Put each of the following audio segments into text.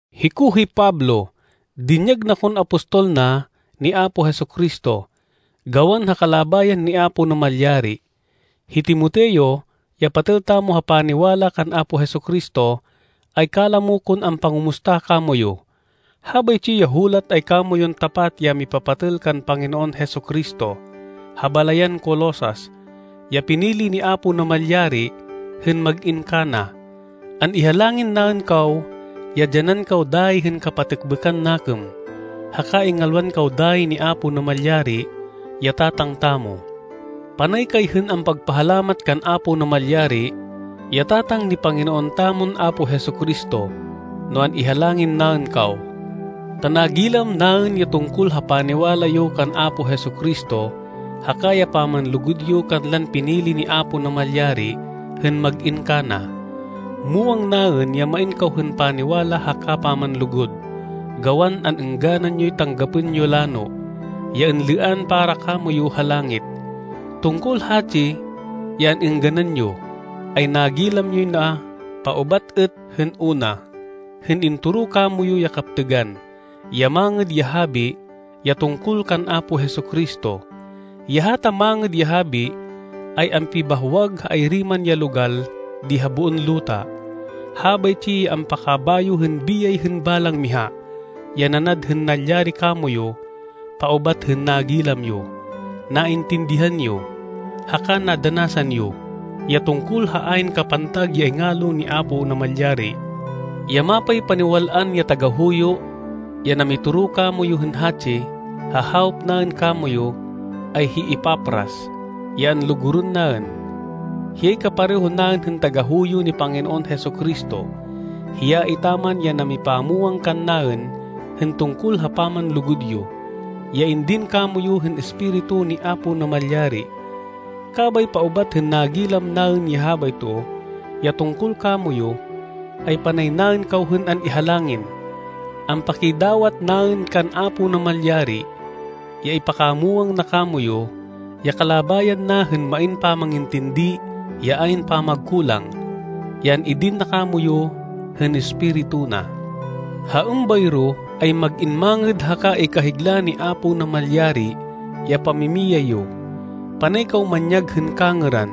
Hiko hi Pablo. Dinyag na kon apostol na, ni Apo Jesu-Cristo, gawan ha kalabayan ni Apo Namalyari. Hi Timoteo, ya patêl tamo ha paniwala kan Apo Jesu-Cristo, ay kalamo kon ampangumusta kamoyu. Habaytsi ya hulat ay kamoyun tapat ya mipapatêl kan Panginoon Jesu-Cristo, ha balayan Colosas, ya pinili ni Apo Namalyari hên mag-in kana. An-ihalangin naên kaw ya dyanan kaw dayi hên kapatêkbêkan nakêm, haka ingalwan kaw dayi ni Apo Namalyari ya Tatang tamo. Panay kay hên ampagpahalamat kan Apo Namalyari, ya Tatang ni Panginoon tamon Apo Jesu-Cristo, no an-ihalangin naên kaw, ta nagilam naên ya tungkol ha paniwala yo kan Apo Jesu-Cristo, haka ya pamanlugud yo kanlan pinili ni Apo Namalyari hên mag-in kana. Muwang naên ya main kaw hên paniwala haka pamanlugud, gawan an-êngganan yoy tanggapên yo lano, ya inlêan para kamoyu ha langit. Tungkol hatsi ya an-êngganan yo, ay nagilam yoy na paubat êt hên una, hên intoro kamoyu ya kaptêgan, ya Mangêd ya Habi, ya tungkol kan Apo Jesu-Cristo. Ya hata Mangêd ya Habi ay ampibahwag ha ayri man ya logal di ha boon luta. Habaytsi ya ampakabayo hên biyay hên balang miha, ya nanad hên nalyari kamoyu paubat hên nagilam yo, naintindihan yo, haka nadanasan yo, ya tungkol ha ayn kapantag ya ingalo ni Apo Namalyari. Ya mapaypaniwal-an ya tagahuyo, ya namitoro kamoyu hên hatsi, ha hawop naên kamoyu, ay hi Epafras, ya anlugurên naên. Hiyay kapareho naên hên tagahuyo ni Panginoon Jesu-Cristo. Hiya etaman ya namipamwang kannaên hên tungkol ha pamanlugud yo, ya indin kamoyu hên Espiritu ni Apo Namalyari. Kabay paubat hên nagilam naên ya habayto, ya tungkol kamoyu, ay panay naên kaw hên an-ihalangin. Ampakidawat naên kan Apo Namalyari, ya ipakamwang na kamoyu, ya kalabayan na hên main pamangintindi ya ayn pamagkulang, ya an-idin na kamoyu hên Espiritu na. Ha êmbayro, ay mag-in mangêd haka ikahigla ni Apo Namalyari, ya pamimiyay yo. Panay kaw manyag hên kangêran,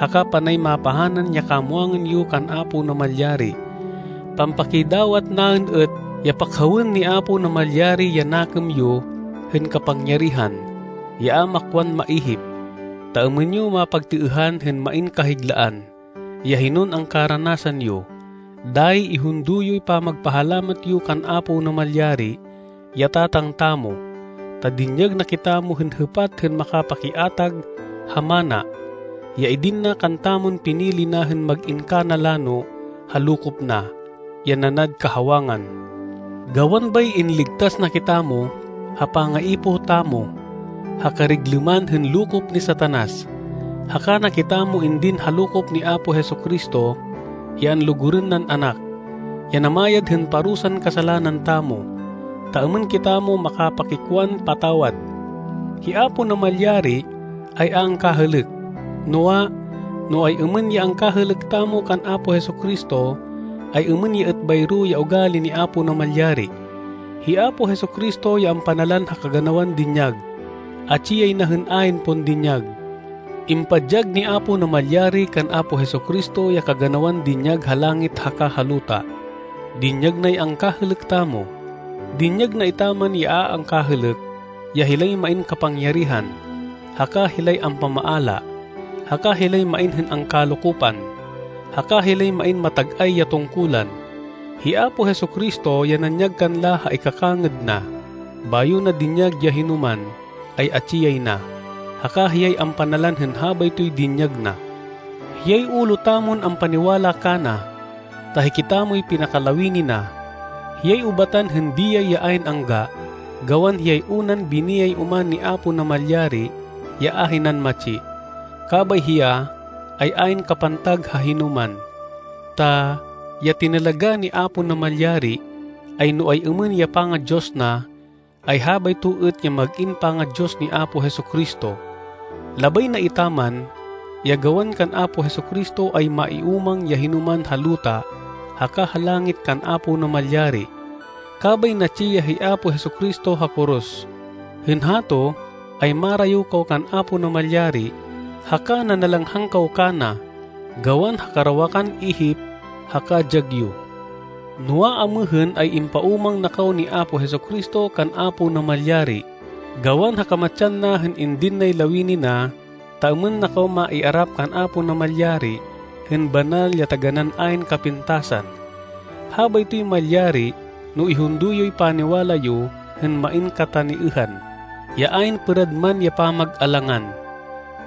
haka panay mapahanan ya kamwangan yo kan Apo Namalyari. Pampakidawat naên êt ya pakhawên ni Apo Namalyari ya nakêm yo hên kapangyarihan, ya a makwan maihip, ta êmên yo mapagtêêhan hên main kahiglaan, ya hinon angkaranasan yo. Dayi ihundo yoy pamagpahalamat yo kan Apo Namalyari, ya Tatang tamo, ta dinyag na kitamo hên hêpat hên makapakiatag ha mana, ya idin na kantamon pinili na hên mag-in kana lano ha lokop na, ya nanad kahawangan. Gawan bay inligtas na kitamo, ha pangaipoh tamo, ha kariglêman hên lokop ni Satanas. Haka na kitamo indin ha lokop ni Apo Jesu-Cristo, ya anlugurên nan Anak, ya namayad hên parusan kasalanan tamo, ta êmên kitamo makapakikwan patawad. Hi Apo Namalyari ay a angkahêlêk. Noa, no ay-êmên ya angkahêlêk tamo kan Apo Jesu-Cristo, ay êmên ya êt bayro ya ugali ni Apo Namalyari. Hi Apo Jesu-Cristo ya ampanalan ha kaganawan dinyag. Atsi yay na hên ayn pon dinyag. Impadyag ni Apo Namalyari kan Apo Jesu-Cristo ya kaganawan dinyag ha langit haka ha luta. Dinyag nay angkahêlêk tamo. Dinyag na etaman ya a angkahêlêk, ya hilay main kapangyarihan, haka hilay ampamaala, haka hilay main hên angkalokopan, haka hilay main matag-ay ya tungkulan. Hi Apo Jesu-Cristo ya nanyag kanla ha ikakangêd na. Bayo na dinyag ya hinoman, ay atsi yay na, haka hiyay ampanalan hên habaytoy dinyag na. Hiyay ulo tamon ampaniwala kana, ta hikitamoy pinakalawini na. Hiyay ubatan hên biyay ya ayn angga, gawan hiyay unan biniyay oman ni Apo Namalyari ya ahinan matsi. Kabay hiya, ay ayn kapantag ha hinoman. Ta ya tinalagá ni Apo Namalyari, ay no ay-êmên ya panga-Diyos na, ay habayto êt ya mag-in panga-Diyos ni Apo Jesu-Cristo. Labay na etaman, ya gawan kan Apo Jesu-Cristo ay maiúmang ya hinoman ha luta haka ha langit kan Apo Namalyari. Kabay natsi ya hi Apo Jesu-Cristo ha koros. Hên hato ay marayo kaw kan Apo Namalyari haka nanalanghang kaw kana, gawan ha karawakan ihip haka dyag yo. Noa, amêhên ay impaúmang na kaw ni Apo Jesu-Cristo kan Apo Namalyari, gawan ha kamatsan na hên indin nay lawini na ta êmên na kaw maiarap kan Apo Namalyari hên banal ya taganán ayn kapintasan. Habaytoy malyari no ihundo yoy paniwala yo hên main kataniêhan, ya ayn pêrad man ya pamag-alangan.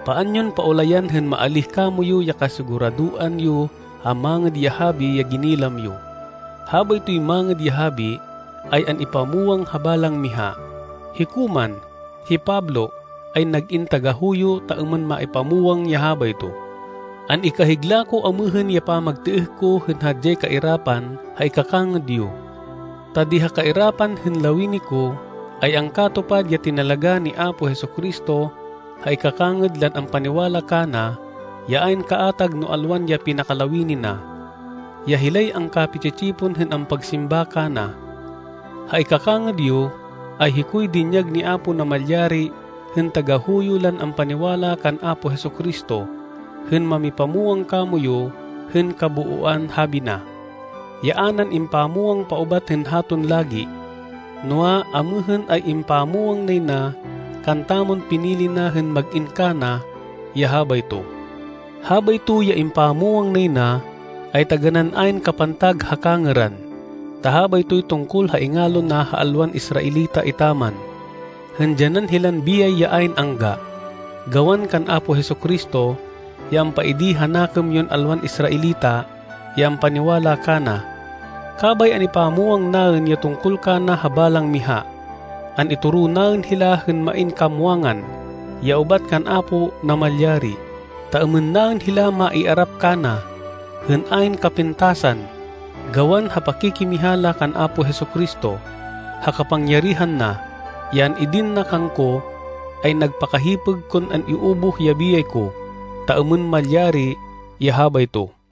Paan yon paulayan hên maalíh kamoyu ya kasiguradoan yo ha Mangêd ya Habi ya ginilam yo. Habaytoy Mangêd ya Habi, ay an-ipamwang ha balang miha. Hiko man, hi Pablo, ay nag-in tagahuyo ta êmên maipamwang ya habayto. An-ikahigla ko amêhên ya pamagtêêh ko hên hadyay kairapan ha ikakangêd yo. Ta di ha kairapan hên lawini ko, ay angkatupad ya tinalagá ni Apo Jesu-Cristo ha ikakangêd lan ampaniwala kana ya ayn kaatag no alwan ya pinakalawini na, ya hilay angkapi-tsi-tsipon hên ampagsimba kana. Ha ikakangêd yo, ay hikoy dinyag ni Apo Namalyari hên tagahuyo lan ampaniwala kan Apo Jesu-Cristo, hên mamipamwang kamoyu hên kabooan Habi na, ya a nan impamwang paubat hên haton lagi. Noa, amêhên ay impamwang nay na kantamon pinili na hên mag-in kana ya habayto. Habayto ya impamwang nay na, ay taganán ayn kapantag ha kangêran, ta habaytoy tungkol ha ingalo na ha alwan Israelita etaman, hên dyanan hilan biyay ya ayn angga, gawan kan Apo Jesu-Cristo, ya ampaidi ha nakêm yon alwan Israelita ya ampaniwala kana. Kabay an-ipamwang naên ya tungkol kana ha balang miha. An-itoro naên hila hên main kamwangan, ya ubat kan Apo Namalyari, ta êmên naên hila maiarap kana, hên ayn kapintasan, gawan ha pakikimiha la kan Apo Jesu-Cristo. Ha kapangyarihan na, ya an-idin na kangko, ay nagpakahipêg kon an-iubuh ya biyay ko, ta êmên malyari ya habayto.